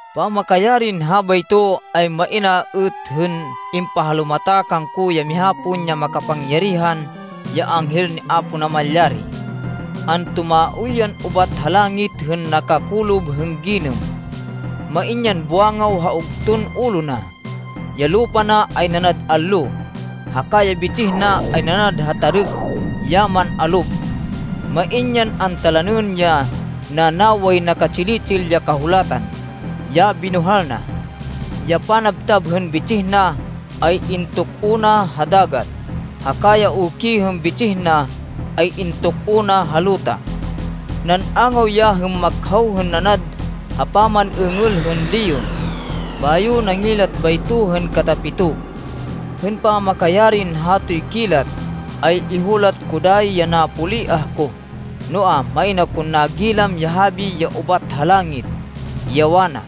Pamakayarin habayto, ay main a êt hên impahalumata kangko ya miha pon ya makapangyarihan ya anghel ni Apo Namalyari. Antumaoy yan ubat ha langit hên nakakolob hên ginêm. Main yan buwangaw ha ugton ulo na, ya lupa na ay nanad allo, haka ya bitsih na, ay nanad ha tarêk ya man-alob. Main yan antalanên ya nanaway, naka-tsili-tsil ya kahulatan, ya binuhal na. Ya panabtab hên bitsih na ay intuk-o na ha dagat, haka ya uki hên bitsih na ay intuk-o na ha luta. Nan-angaw ya hên makhaw hên nanad ha paman-êngêl hên leon, bayo nangilat bayto hên katapito. Hên pamakayarin hatoy kilat, ay ihulat ko dayi ya napoliah ko, noa, main akon nagilam ya habi ya ubat ha langit, ya wana,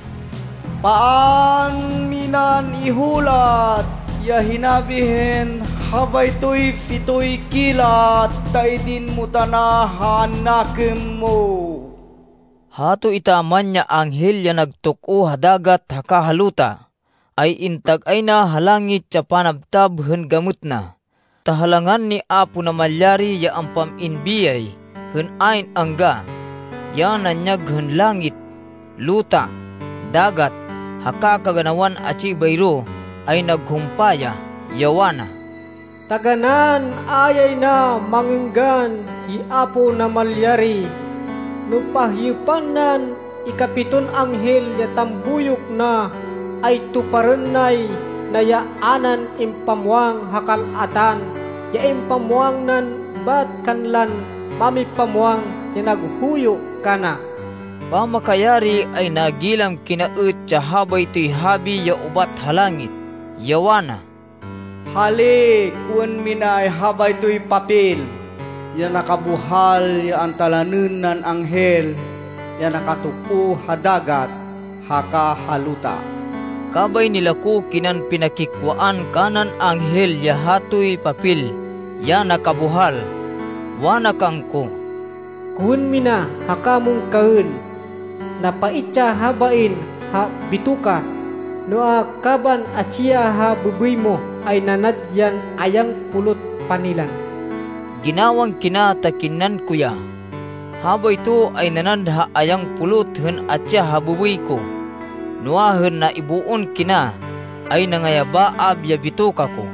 “Paan minan ihulat ya hinabi hên habaytoy pitoy kilat ta idin mo tana ha nakêm mo!” Hato etaman ya anghel ya nagtok-o ha dagat haka ha luta, ay intag-ay na ha langit ya panabtab hên gamêt na, ta ha langan ni Apo Namalyari, ya ampam-in biyay hên ayn angga, ya nanyag hên langit, luta, dagat, haka kaganawan atsi bayro ay naghumpa ya, ya wana, “Taganán a yay na mangênggan hi Apo Namalyari! No pahyêpan nan ikapiton anghel ya tambuyok na, ay tuparên nay na ya a nan impamwang ha kal-atan, ya impamwang nan bat kanlan mámipamwang ya naghuyo kana.” Pamakayari, ay nagilam kina êt ya habaytoy habi ya ubat ha langit, ya wana, “Hali, kowên minay habaytoy papel ya nakabuhal ya antalanên nan anghel ya nakatok-o ha dagat haka ha luta.” Kabay nilako kinan pinakikwaan kanan anghel ya hatoy papel ya nakabuhal. Wana kangko, “Kowên mina haka mon kaên. Napait ya habain ha bitoka, noa, kaban atsi ya ha bêbêy mo ay nanad yan ayang pulot panilan.” Ginawang kina ta kinnan ko ya. Habayto ay nanad ha ayang pulot hên atsi ya ha bêbêy ko, noa, hên naiboon kina, ay nangayabaab ya bitoka ko.